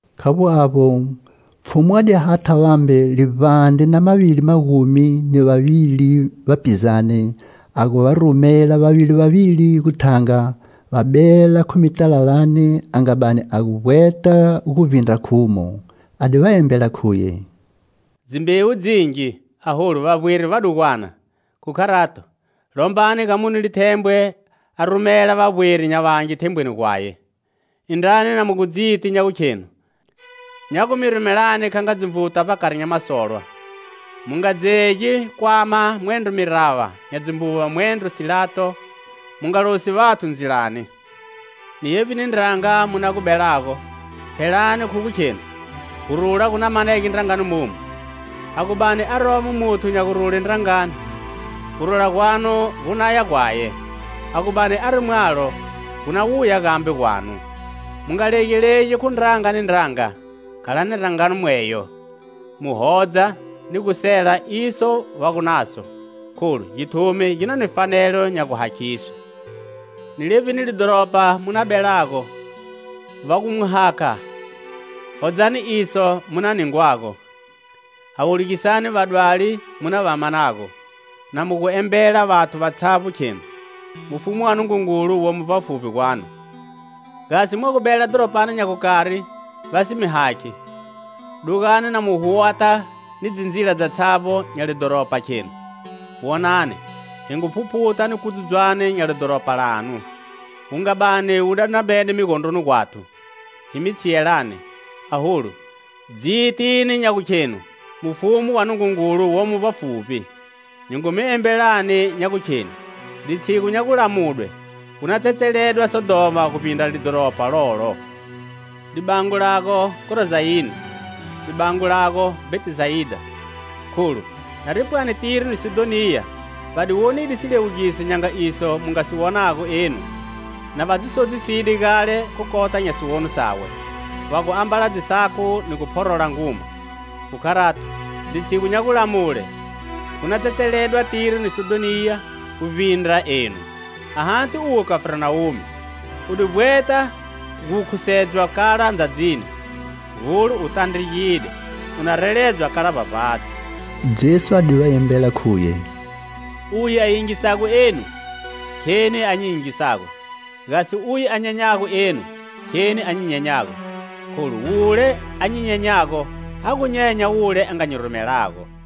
Khavbo avbo, Pfhumu a di hatha vambe livbandre na mavili magumi ni vavili vapizane, a gu va rumela vavili vavili gu thanga, va bela khu mitalalani a nga bani a gu vbweta gu vbindra khumo. A di va embela, khuye: "Dzimbewu dzingi, aholu vavbweri vadugwana, khu kharato, lombani ga mune lithembwe a rumela vabweri nya vangi thembweni gwaye. Indrani na mu gu dziti nya gukhenu nya gu mi rumelani kha nga dzinvuta vbakari nya masolwa. Mu nga dzegi kwama, mwendro mirava nya dzimbuva, mwendro silato; mu nga losi vathu ndzilani. Ni yevbi ndranga mu na gu belago, phelani khu gu khenu: 'Gurula gu na manege ndrangani momu!' A gu bani aromo muthu nya gurule ndrangani, gurula gwanu gu naya gwaye; a gu bani ari mwalo, gu na wuya gambe gwanu. Mu nga legalegi khu ndranga ni ndranga. Khalani ndrangani mweyo, mu hodza ni gu sela iso va gu naso, kholu githumi gi na ni fanelo nya guhakhiswe. Ni levbini lidhoropa mu na belago, va gu mu hakha, hodzani iso mu na ningwago, hawulugisani vadwali mu na va manago, na mu gu embela vathu vatshavbo, khenu: 'Mufumu wa Nungungulu womo vbafuvbi gwanu.' Gasi mwagu bela dhoropani nya gukari va si mi hakhi, dugani na mu gu huwata ni dzindzila dzatshavbo nya lidhoropa, khenu: 'Wonani, hi ngu phuphuta ni kudzudzwane nya lidhoropa lanu, wu nga bani wu dandramede migondroni gwathu, hi mi tshiyelani. Aholu dzitini nya gu khenu mufumu wa Nungungulu womo vbafuvbi.' Nyi ngu mi embelani nya gukheni litshigu nya gulamudwe gu na tsetseledwa Sodhoma guvbindra lidhoropa lolo. "Libango lago Khorozayine! Libango lago, Bhetisayida! Kholu nari pwani Tiro ni Sidhoniya va di wonide siliwugiso nya nga iso mu nga si wonago enu, na va dzi sodziside gale khu kota nya siwono sawe, va gu ambala dzisaku ni gu phorola nguma. Khu kharato, litshigu nya gulamule gu na tsetseledwa Tiro ni Sidhoniya gu vbindra enu. Ahati uwe, Khafarnawume! U di vbweta gu khusedzwa kala ndzadzini? Hulo, u tandregide! Una reledzwa kala vbavbatshi." Jesu a di va embele, khuye: "Uye a yingisago enu, kheni a nyi yingisago; gasi uye a nyenyago enu kheni a nyi nyenyago. Kholu wule a nyi nyenyago, a gu nyenya wule a nga nyi rumelago."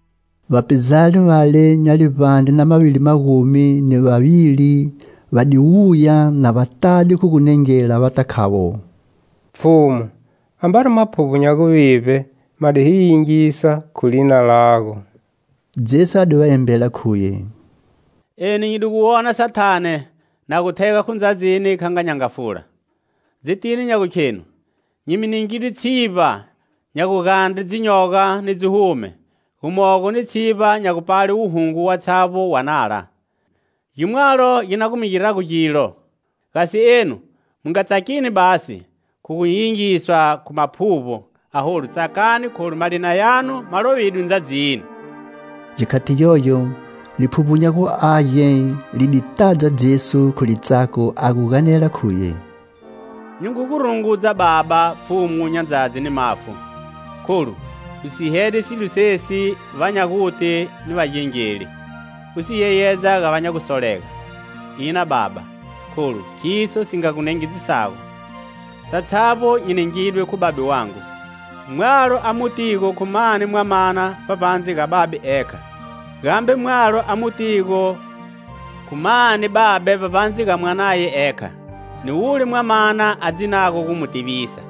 Vapizane vale nya livbandre na mavili magumi ni vavili va di wuya na va tade khu gunengela, vata khavo: "Pfhumu, ambari maphuvbo nya guvivbe ma di hi yingisa khu lina lago!" Jesu a di va embela, khuye: "Eni nyi di gu mu wona Sathane na gu thega khu ndzadzini kha nga nyangafula. Dzitini nya gukhenu nyi mi ningide tshivba nya gugandre dzinyoga ni dzihume, gumogo ni tshivba nya gupale wuhungu watshavbo wa nala. Gi mwalo gi na gu mi girago gilo. Gasi enu, mu nga tsakini basi khu gu yingiswa khu maphuvbo. Aholu tsakani kholu malina yanu ma lovidwe ndzadzini." Gikhati gyogyo, Liphuvbo nya gu Age li di tadza Jesu khu litsako a gu ganela khuye: "Nyi ngu gu rungudza, Baba, Pfhumu nya ndzadzi ni mafu, kholu u sihede silo sesi va nya guti ni vagengeli, u si yeyedza ga va nya gusolega. Ina, Baba, kholu khiso si nga gu nengedzisago. Satshavbo nyi ningidwe khu Babe wangu. Mwalo a mu tigo khu mani Mwamana vbavbandze ga Babe ekha, gambe mwalo a mu tigo khu mani Babe vbavbandze ga Mwanaye ekha ni wule Mwamana a dzinago gu mu tivisa."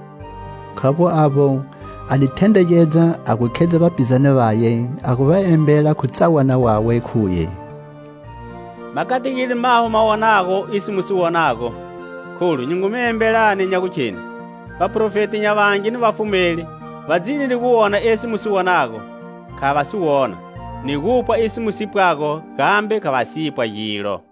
Khavbo avbo, a di thendregedza a gu khedza vapizane vaye, a gu va embela khu tsawana wawe, khuye: "Ma kategide maho ma wonago iso mu si wonago. Kholu nyi ngu mi embelani nya gukheni: vaprofeti nya vangi ni vafumeli va dzinide gu wona esi mu si wonago, kha va si wona; ni gupwa iso mu si pwago, gambe kha va si pwa gilo!"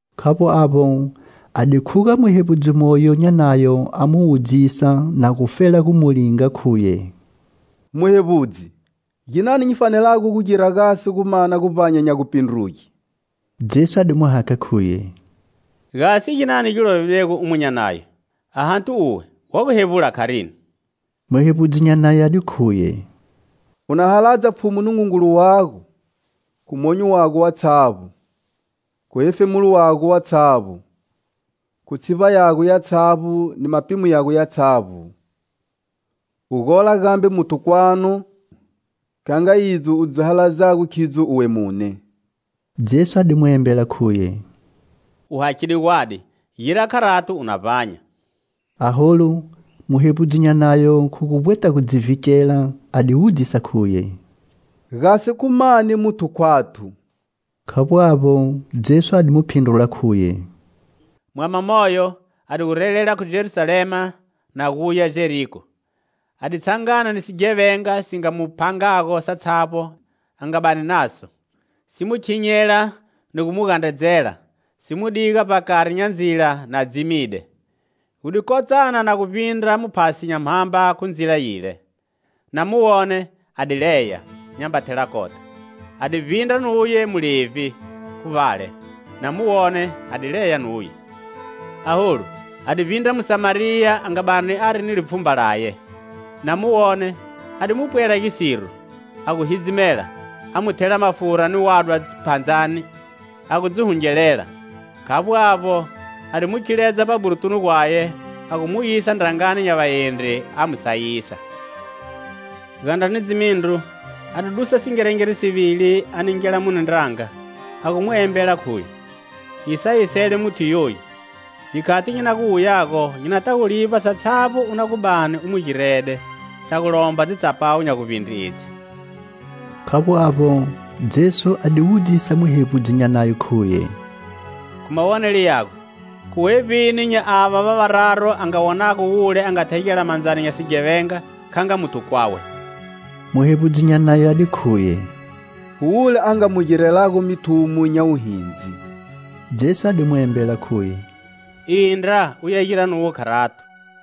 Khavbo avbo, a di khuga muhevbudzi moyo nya Nayo a mu wudzisa, na gufela gu mu linga, khuye: "Muhevbudzi, ginani nyi fanelago gu gira gasi gu mana guvbanya nya gupindruge?" Jesu a di mu hakha, khuye: "Gasi ginani gi lovidwego omu nya Nayo? Ahati uwe wa gu hevbula kharini?" Muhevbudzi nya Nayo a di khuye: "U na haladza Pfhumu Nungungulu wago, khu monyo wago watshavbo, khu hefemulo wago watshavbo, khu tshivba yago yatshavbo ni mapimo yago yatshavbo; u gola gambe muthu kwanu kha nga idzo u dzi haladzago khidzo uwe mune." Jesu a di mu embela, khuye: "U hakhide gwadi. Gira kharato, u na vbanya." Aholu muhevbudzi nya Nayo khu gu vbweta gu dzi vhikela, a di wudzisa, khuye: "Gasi khu mani muthu khwathu?" Khavbo avbo, Jesu a di mu phindrula, khuye: "Mwama moyo a di gu relela khu Jerusalema na guya Jeriko. A di tshangana ni sighevenga si nga mu phangago satshavbo a nga bani naso, si mu khinyela ni gu mu gandredzela, si mu diga vbakari nya ndzila na dzimide. Gu di kotsana na gu vbindra muphasi nya mhamba khu ndzila yile. Na mu wone, a di leya, nyamba thela kota. A di vbindra nuye mulevhi khu vbale. Na mu wone, a di leya nuye. Aholu a di vbindra Musamariya, a nga bani ari ni lipfhumba laye, na mu wone, a di mu pwela gisiro, a gu hidzimela, a mu thela mafura ni wadwa dziphandzani, a gu dzi hungelela. Khavbo avbo, a di mu khiledza vbaburutunu gwaye, a gu mu yisa ndrangani nya vaendri; a mu sayisa. Gandra ni dzimindru a di dusa singerengere sivili a ningela mune ndranga, a gu mu embela, khuye: 'Nyi sayisele muthu yoyu. Gikhati nyi na gu wuyago nyi nata gu livba satshavbo u na gu bani u mu girede, sa gu lomba dzitsapawu nya guvbindre edzi.' " Khavbo avbo, Jesu a di wudzisa muhevbudzi nya Nayo, khuye. "Khu mawonelo yago, khu wevbini nya ava va vararu a nga wonago wule a nga thegela mandzani nya sighevenga kha nga muthu kwawe?" Muhevbudzi nya Nayo a di khuye: "Khu wule a nga mu girelago mithumo nya wuhindzi." Jesu a di mu embela khuye. "Indra uya gira nuwe kharato."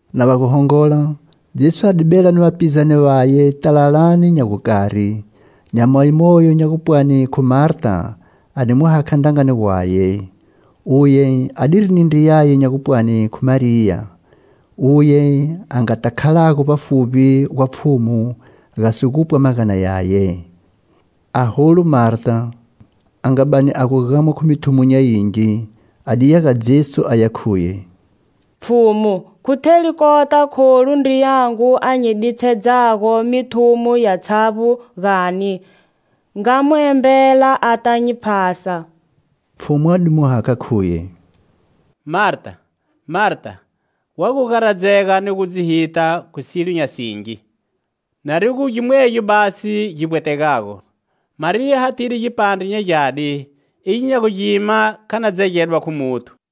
Na va gu hongola, Jesu a di bela ni vapizane vaye talalani nya gukari. Nyamayi moyo nya gupwani khu Marta, a di mu hakha ndrangani gwaye. Uye adiri ni ndriyaye nya gupwani khu Mariya, uye a ngata khalago vbafuvbi gwa Pfhumu, gasi gupwa magana yaye. Aholu Marta, a nga bani a gu gamwa khu mithumo nya mingi, a diya ga Jesu aya khuye: "Pfhumu, khu theli kota kholu ndriyangu a nyi ditshedzago mithumo yatshavbo, gani? Nga mu embela ata nyi phasa." Pfhumu a di mu hakha, khuye: "Marta, Marta, wa gu garadzega ni gu dzi hita khu silo nya singi, narigu gimwegyo basi gi vbwetegago. Mariya hathide gipandre nya gyadi, igyo nya gu gima kha na dzegedwa khu muthu."